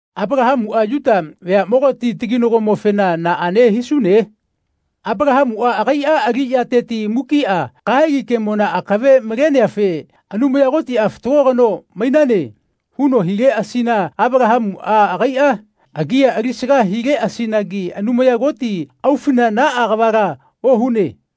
Apalahamuꞌa Yuta veaꞌmogati taginagomofena naꞌane hisune? Apalahamuꞌa agaiꞌa aliꞌyateti mukiꞌa kahegi kemona akave maleneafe Anumaya Kotiꞌa “Fatago kano mainane.” huno hileꞌasina Apalahamuꞌa agaiꞌa agia alisaga hileꞌasinagi Anumaya Koti aufina naꞌa kavala ohune.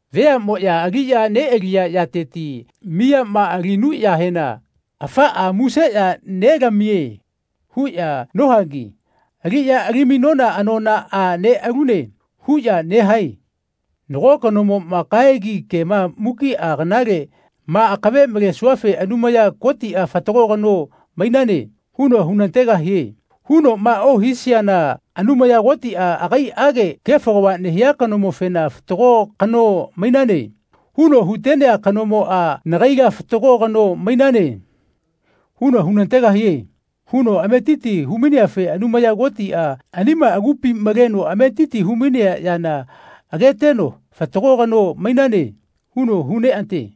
Veaꞌmoꞌya aliꞌya neꞌaliya yateti miyama alinuꞌyahena ani miyafena “Afaꞌa muse ya nelamie.” huꞌya nohagi “Aliꞌya alimainona anonaꞌa neꞌalune.” huꞌya nehae. Nago kanomoꞌma “Kahegi kema mukiꞌa kanaleꞌma akave malesuafe Anumaya Kotiꞌa ‘Fatago kano mainane.’ huno hunategahie.” hunoꞌma ohisiana “Anumaya Kotiꞌa agaiꞌage kefo kava nehia kanomofena ‘Fatago kano mainane.’ huno hutenea kanomoꞌa nagaila ‘Fatago kano mainane.’ huno hunategahie.” huno ametiti humaineafe Anumaya Kotiꞌa anima agupi maleno ametiti humainea yana ageteno “Fatago kano mainane.” huno huneꞌate.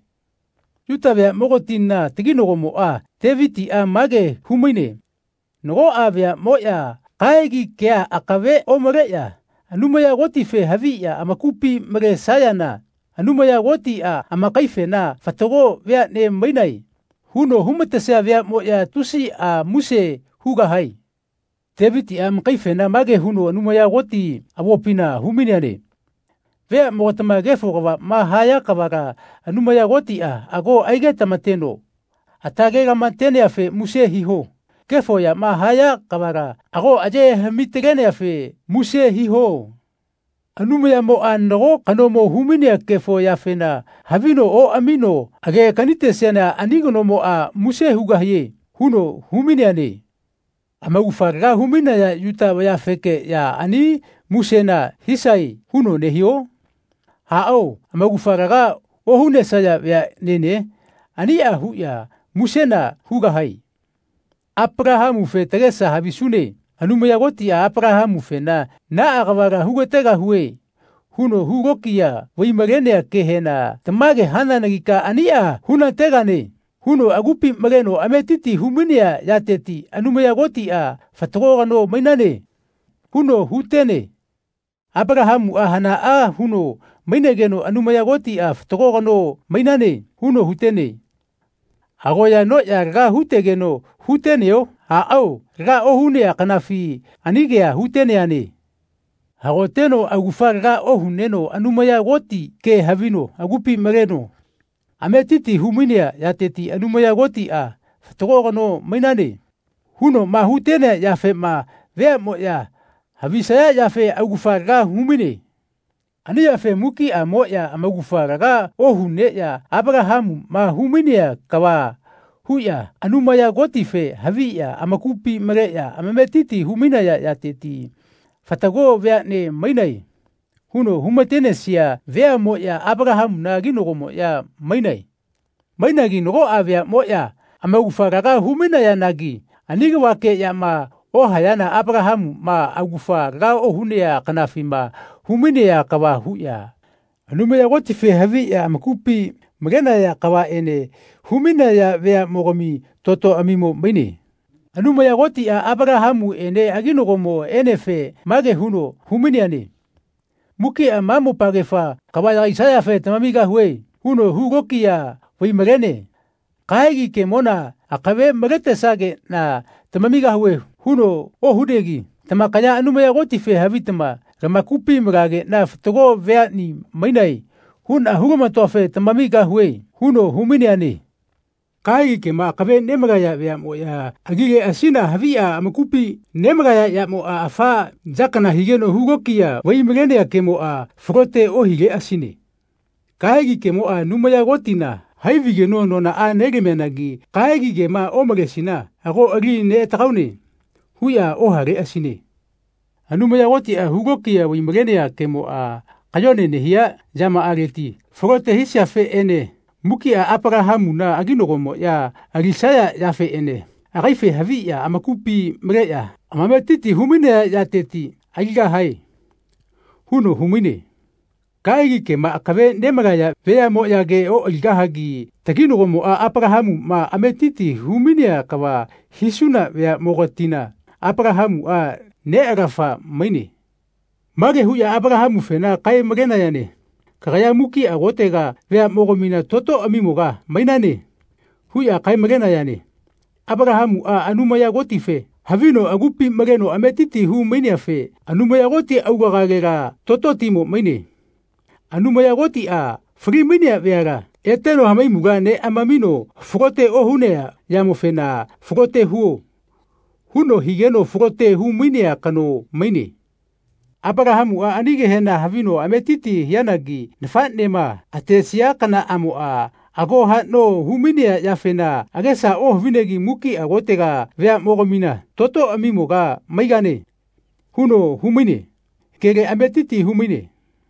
Yuta veaꞌmogatina taginagomoꞌa, Tevitiꞌa, mage humaine nagoꞌa veaꞌmoꞌya kahegi kea akave omaleꞌya Anumaya Kotife haviꞌya amakupi malesayana Anumaya Kotiꞌa amakaifena “Fatago veaꞌne mainae.” huno humatesia veaꞌmoꞌya tusiꞌa muse hugahae. Tevitiꞌa amakaifena mage huno Anumaya Koti avopina humaineane “Veaꞌmogatama kefo kavaꞌma haya kavala Anumaya Kotiꞌa ago aigetamateno atalelamateneafe muse hiho. Kefo yama haya kavala ago ayehaꞌmi-taleneafe muse hiho. Anumayamoꞌa nago kanomo humainea kefo yafena havino oꞌamino age kanitesiana ani kanomoꞌa muse hugahie.” huno humaineane. Amaugafa laga humainaya Yuta vayafekeꞌya ani musena hisae huno nehio? Aꞌao, amaugafa laga ohunesaya veaꞌnene aniꞌa huꞌya musena hugahae. Apalahamufe tagesa havisune. Anumaya Kotiꞌa Apalahamufena “Naꞌa kavala hugategahue.” huno hulokiya vaimalenea kehena “Tamage hananagika aniꞌa hunategane.” huno agupi maleno ametiti humainea yateti Anumaya Kotiꞌa “Fatago kano mainane.” huno hutene. Apalahamuꞌa hanaꞌa huno mainegeno Anumaya Kotiꞌa “Fatago kano mainane.” huno hutene? Agoya anoꞌya laga hutegeno huteneo? Aꞌao, laga ohunea kanafi ani kea huteneane. Hagoteno augafa laga ohuneno Anumaya Koti kea havino agupi maleno ametitia humainea yateti Anumaya Kotiꞌa “Fatago kanoa mainane.” hunoꞌma hutenea yafema veaꞌmoꞌya havisaya yafe augafa laga humaine. Ani yafe mukiꞌamoꞌya amaugafa laga ohuneꞌya Apalahamuꞌma humainea kava huꞌya Anumaya Kotife haviꞌya amakupi maleꞌya amametiti humainaya yateti “Fatago veaꞌne mainae.” huno humatenesia veaꞌmoꞌya Apalahamuna aginagomoꞌya mainae. Mainagi nagoꞌa veaꞌmoꞌya amaugafa laga humainayanagi ani kavakeꞌyama ohayana Apalahamuꞌma augafa laga ohunea kanafima humainea kava huꞌya Anumaya Kotife haviꞌya amakupi malenaya kavaꞌene humainaya veaꞌmogami totoꞌamimo maine. Anumaya Kotiꞌa Apalahamuꞌene aginagomoꞌenefe mage huno humaineane “Mukiꞌa ma mopagefa kava yagaisayafe tamamigahue.” huno hulokiya vaimalene. “Kahegi kemona akave maletesageꞌna tamamigahue.” huno ohunegi “Tamakaya Anumaya Kotife havitama lamakupi malageꞌna ‘Fatago veaꞌni mainae.’ huꞌna hulamatoafe tamamigahue.” huno humaineane. Kahegi kema akave nemalaya veaꞌmoꞌya alileꞌasina haviꞌya amakupi nemalaya yamoꞌa afa ya kana higeno hulokiya vai-malenea kemoꞌa falote ohileꞌasine. Kahegi kemoꞌa Anumaya Kotina hai vaigeno anonaꞌa nelamianagi kahegi kema omalesina “Ago ali neꞌatagaune.” huꞌya ohaleꞌasine. Anumaya Kotiꞌa hulokiya vai-malenea kemoꞌa kayone nehia yamaꞌaleti falote hisiafeꞌene mukiꞌa Apalahamuna aginagomoꞌya alisaya yafeꞌene “Agaife haviꞌya amakupi maleꞌya amametiti humainaya yateti aligahae.” huno humaine. Kahegi kema akave nemalaya veaꞌmoꞌyage oꞌaligahagi taginagomoꞌa, Apalahamuꞌma, ametiti humainea kava hisuna veaꞌmogatina Apalahamuꞌa neꞌalafa maine. Mage huꞌya Apalahamufena kae-malenayane “Kagaya mukiꞌa kotega veaꞌmogamina totoꞌamimoga maigane.” huꞌya kae-malenayane. Apalahamuꞌa Anumaya Kotife havino agupi maleno ametiti humaineafe Anumaya Koti aulagalela tototimo maine. Anumaya Kotiꞌa falimainaya veala eteno hamaimula neꞌamamino falote ohunea yamofena “Falote huo.” huno higeno falote humainea kano maine. Apalahamuꞌa ani kehena havino ametitia hianagi nafaꞌnema atesia kanaꞌamoꞌa ago haꞌno humainea yafena agesa ohavinegi “Mukiꞌa kotega veaꞌmogamina totoꞌamimoga maigane.” huno humainea kele ametiti humaine.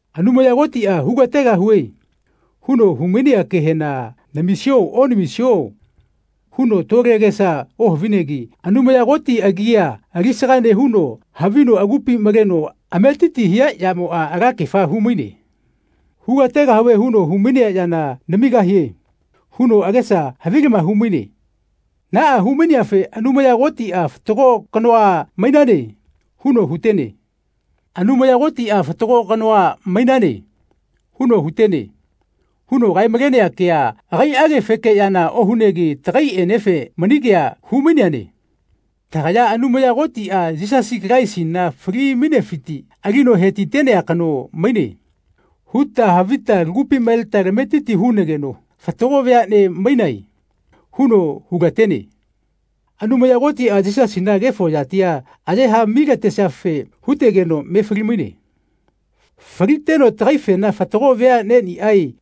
Anumaya Kotiꞌa “Hugategahue.” huno humainea kehena “Namisio onamisio?” huno tole agesa ohavinegi Anumaya Koti agia alisaga nehuno havino agupi maleno ametiti hia yamoꞌa alakefa humaine. “Hugategahue huno humainea yana namigahie.” huno agesa havilama humaine. Naꞌa humaineafe Anumaya Kotiꞌa “Fatago kanoa mainane.” huno hutene. “Anumaya Kotiꞌa ‘Fatago kanoa mainane.’ huno hutene.” huno kae-malenea kea agaiꞌagefekeꞌyana ohunegi tagaiꞌenefe mani kea humaineane. Tagaya “Anumaya Kotiꞌa Yisasi Kalaisina falimainefiti alino hetitenea kano maine.” huta havita lagupi maleta tametiti hunageno “Fatago veaꞌnea mainae.” huno hulatene. Anumaya Kotiꞌa Yisasina kefo yatia ayehaꞌmi-talesiafe hutegeno me falimaine. Faliteno tagaifena “Fatago veaꞌneꞌniꞌae.”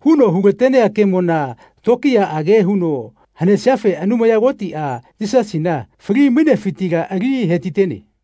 huno hulatenea kemona tokiyaꞌage huno hanesiafe Anumaya Kotiꞌa Yisasina fali-mainefitila ali hetitene.